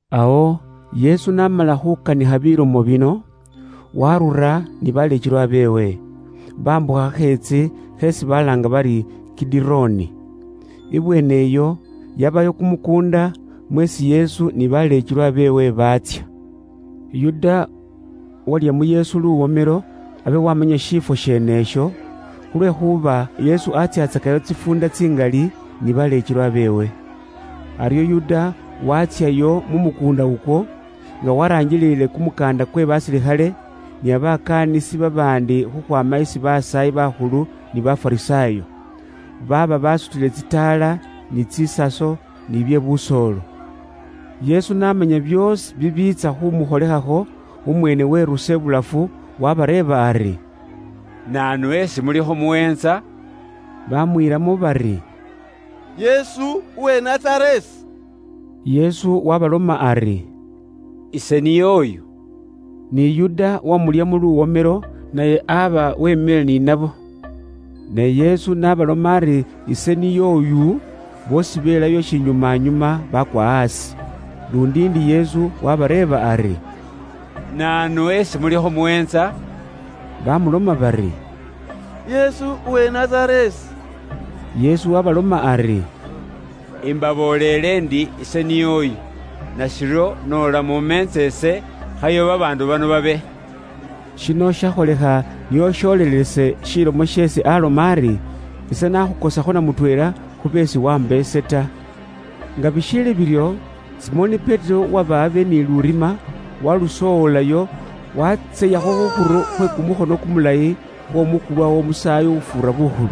Awo Yesu n'amala khuukanikha bilomo bino, waarura ni baleekelwa beewe, baambukha khakheetsi kheesi balaanga bari Kidironi. Ibweene iyo yabayo kumukuunda, mweesi Yesu ni baleekelwa beewe baatsya. Yuda uwalya mu Yesu luwomelo abe waamanya shiifwo sheenesho, khulwekhuuba Yesu atsyaatsakayo tsifuunda tsingali ni baleekelwa beewe. Aryo Yuda waatsyayo mu mukuunda ukwo, nga waraangilile kumukaanda kwe basilikhale, ni babakaanisi babaandi khukhwaama isi basaayi bakhulu ni Bafarisaayo. Baaba basutile tsitaala, ni tsisaso, ni bye busoolo. Yesu n'amanya byoosi bibiitsya khumukholekhakho, umweene weerusa ibulafu, waabareeba ari, “Naanu esi mulikho muweentsa?” Baamwiilamo bari, “Yesu, uwe Nazareesi.” Yesu waabaloma ari, “Ise niy'oyu.” Ni Yuda uwamulyamo luwomelo naye aba weemile ni nabo. Ne Yesu n'abaloma ari, “Ise niy'oyu,” boosi beelayo shinyumanyuma baakwa aasi. Luundi ndi Yesu waabareeba ari, “Naanu esi mulikho muweentsa?” Baamuloma bari, “Yesu uwe Nazareesi.” Yesu waabaloma ari, “Imbabooleele ndi ise niy'oyu. Nashiryo noola mumeentsa ise, khayo babaandu bano babe.” Shino shakholekha nio shilomo sholelese sheesi aaloma ari, “Ise naakhukosakho na mutweela khu beesi waamba ise ta.” Nga bishiili biryo, Simoni Petero, uwaba abe ni lurima, waalusoowolayo, waatseyakho khukhuru khwe kumukhono kumulayi, khw'omukulwa w'Omusaayi ufuura bukhulu.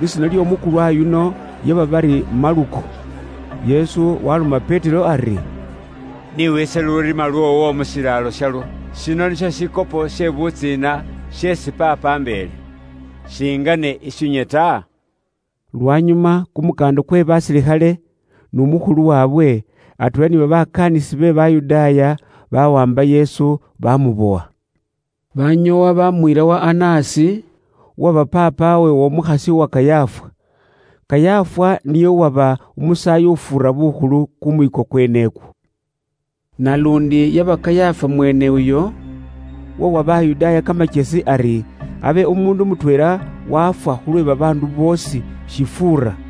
Lisiina ly'omukulwa yuno, lyaba bari Maluko. Yesu waaloma Petero ari, “Ni wiise lurima lwoowo mu shilaalo shalwo. Shino nisho shikopo she butsiina sheesi Paapa ambeele. Shingane ishinywe ta?” Lwanyuma, kumukaanda kwe basilikhale n'umukhulu waabwe, atweela ni babakaanisi be Bayudaaya, bawaamba Yesu bamubowa. Banyoowa baamuyila wa Anasi, uwaba paapawe w'omukhasi uwa Kayafa. Kayafa niye uwaba umusaayi ufuura bukhulu kumwiiko kwen'ekwo. Naluundi yaba Kayafa mwene uyo, uwawa Bayudaaya kamakyesi ari abe umuundu mutweela wafwa khulwe babaandu boosi, shifuura.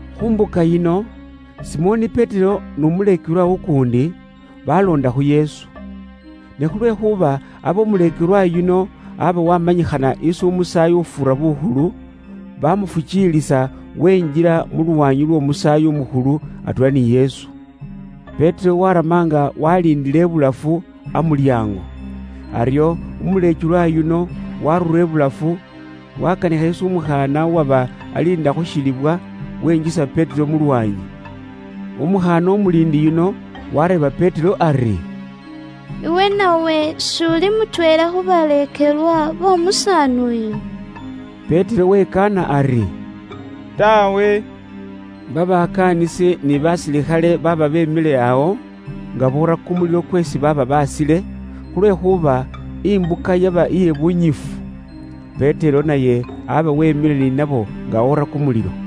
Khu mbuka yino, Simoni Petero n'umuleekelwa ukuundi, baloonda khu Yesu. Ne khulwekhuuba abe umuleekelwa yuno aba waamanyikhana isi Umusaayi ufuura bukhulu, baamufukiilisa wenjila mu lwaanyi lw'Omusaayi umukhulu, atweela ni Yesu. Petero waarama nga waaliindile ibulafu, amulyaango. Aryo umuleekelwa yuno abe esi umusaayi umukhulu aamanya, waarura ibulafu, waakanikha isi umukhaana uwaba aliinda khu shilibwa, wenjisa Petero mu lwaanyi. Umukhaana umuliindi yuno waareeba Petero ari, “Iwe nawe s'uli mutweela khu baleekelwa b'omusaani uyu?” Petero wekaana ari, “Taawe.” Babakaanisi ni basilikhale baaba beemile awo nga boora kumulilo kweesi baaba baasile, khulwekhuuba imbuka yaba iye bunyifu. Petero naye aba weemile ni nabo nga oora kumulilo.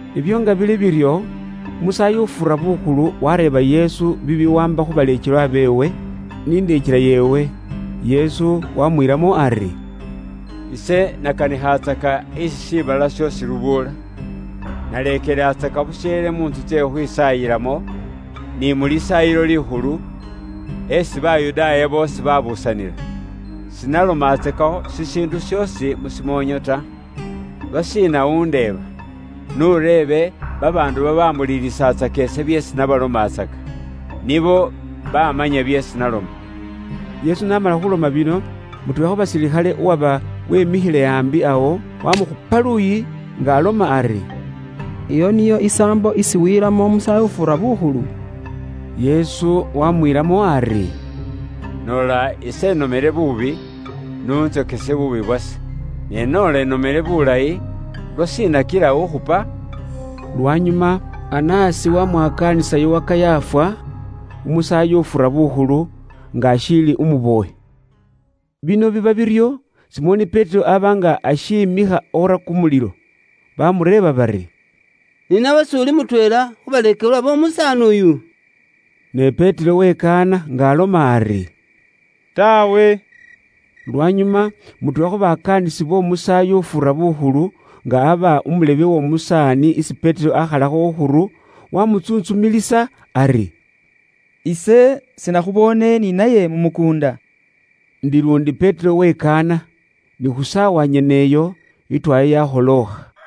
Ibyo nga bili biryo, Umusaayi ufuura bukhulu wareeba Yesu bibiwaamba khu baleekelwa beewe, ni ndeekela yeewe. Yesu wamwilamo ari, “Ise nakanikhatsaka isi shiibala shoosi lubuula. Naleekelatsaka busheele mu ntsu tsye khukhwisaayilamo, ni mu Lisaayilo Likhulu, esi Bayudaaya boosi babuusanila. Sinalomatsakakho shishiindu shoosi mu shimoonyo ta. Lwashiina undeeba? N'ureebe babaandu babaambuliilisatsaka ise byeesi nabalomatsaka. Nibo baamanya byeesi naloma.” Yesu n'amala khuloma bino, mutweela khu basilikhale uwaba wemikhile ambi awo, wamukhupa luuyi, nga aloma ari, “Iyo niyo isaambo isi wiilamo Umusaayi ufuura bukhulu?” Yesu wamwiilamo ari, “Noola ise inomele buubi, n'untsokese buubi bwase. Ne noola inomele bulayi, lwashiina kila ukhupa?” Lwanyuma Anasi wamwakaanisayo wa Kayafa, Umusaayi ufuura bukhulu, nga ashiili umubowe. Bino biba biryo, Simoni Petero aba nga ashiimikha oora kumulilo. Baamureeba bari, “Ni nawe s'uli mutweela khu baleekelwa b'omusaani uyu?” Ne Petero wekaana nga aloma ari, “Taawe.” Lwanyuma mutweela khu bakaanisi b'omusaayi ufuura bukhulu, nga aba umulebe w'omusaani isi Petero akhalakho khukhuru, wamutsuntsumilisa ari, “Ise sinakhuboone ni naye mu mukuunda?” Indi luundi Petero wikaana. Ni khu saawa nyene iyo, itwaya yakholookha.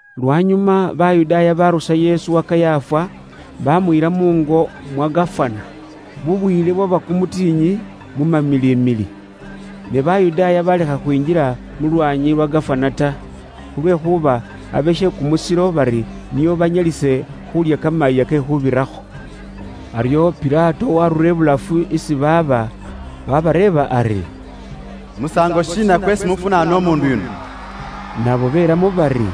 Lwanyuma Bayudaaya baarusa Yesu wa Kayafa, baamuyila muungo mwa Gafana. Bubwiile bwaba kumutikhinyi, mu mamilimili. Ne Bayudaaya baalekha khwinjila mu lwaanyi lwa Gafana ta, khulwekhuuba abe she kumusilo, bari nio banyalise khuulya Kamayiiya ke Khuubirakho. Aryo Pilato waarura ibulafu isi baaba, wabareeba ari, “Musaango shiina kweesi mufunaana umuundu yuno?” Nabo beelamo bari,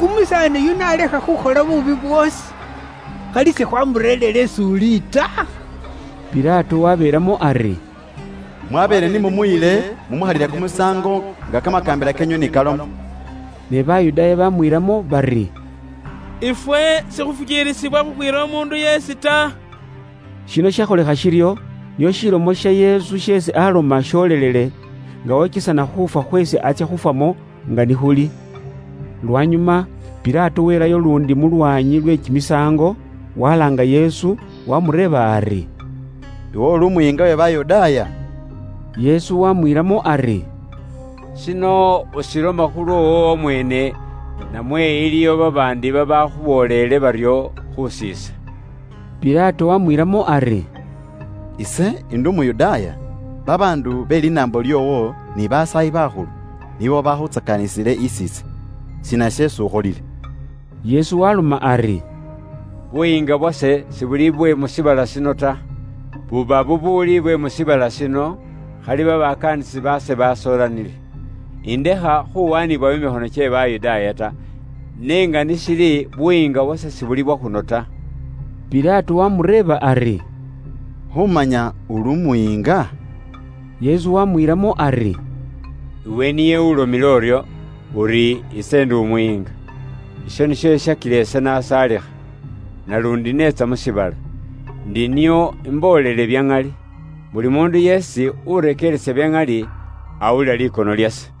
“Umusaani yuno alekha khukhola buubi bwoosi, khali sikhwamureerire is'uli ta.” Pilato wabeelamo ari, “Mwabeene ni mumuyile mumukhalile kumusaango nga kamakaambila keenywe ni kaloma.” Ne Bayudaaya bamwiilamo bari, “Ifwe sikhufukiilisibwa khukhwiira umuundu yeesi ta.” Shino shakholekha shiryo nio ilomo ya Yesu isi aaloma yoolele, nga okesana khuufwa khweesi atsya khufwamo nga ni khuli. Lwanyuma Pilato welayo luundi mu lwaanyi lwe kimisaango, walaanga Yesu, waamureeba ari, “Iwe uli Umuyiinga we Bayudaaya?” Yesu waamwiilamo ari, “Shino ushiloma khu lwoowo wamweene, namwe iliyo babaandi babaakhubooleele baryo khus'ise?” Pilato waamwiilamo ari, “Ise ndi Umuyudaaya? Babaandu be linaambo lyoowo ni Basaayi bakhulu nibo babaakhuntsakaanisile isi ise. Shiina sheesi ukholile?” Yesu waaloma ari, “Buyiinga bwase sibuli bwe mu shiibala shino ta. Buba bubuuli bwe mu shiibala shino, khali babakaanisi baase basoolanile, indekha khuwaanibwayo mu mikhono kye Bayudaaya ta. N'enga ni shili, buyiinga bwase sibuli bwa khuno ta.” Pilato waamureeba ari, “Khuumanya uli Umuyiinga?” Yesu waamwiilamo ari, “Iwe niye ulomile uryo, uri ise ndi Umuyiinga. Isho nisho shishakila ise naasaalikha. Naluundi neetsa mu shiibala, ndi nio imboolele bya ŋali. Buli muundu yeesi urekeeresa bya ŋali, awulila likono lyase.”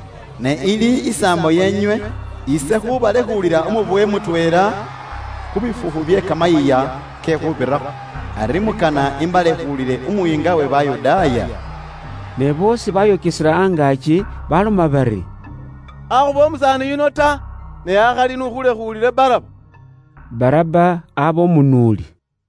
Ne ili isaambo yeenywe ise khuubalekhuulila umubowe mutweela khu bifukhu bye Kamayiiya ke Khuubirakho. Ari mukana imbalekhuulile Umuyiinga we Bayudaaya?” Ne boosi bayokesela angaaki, baaloma bari, “Akhuba umusaani yuno ta. Ne akhali iwe n'ukhulekhuulile ifwe Baraba!” Baraba aba umunuuli.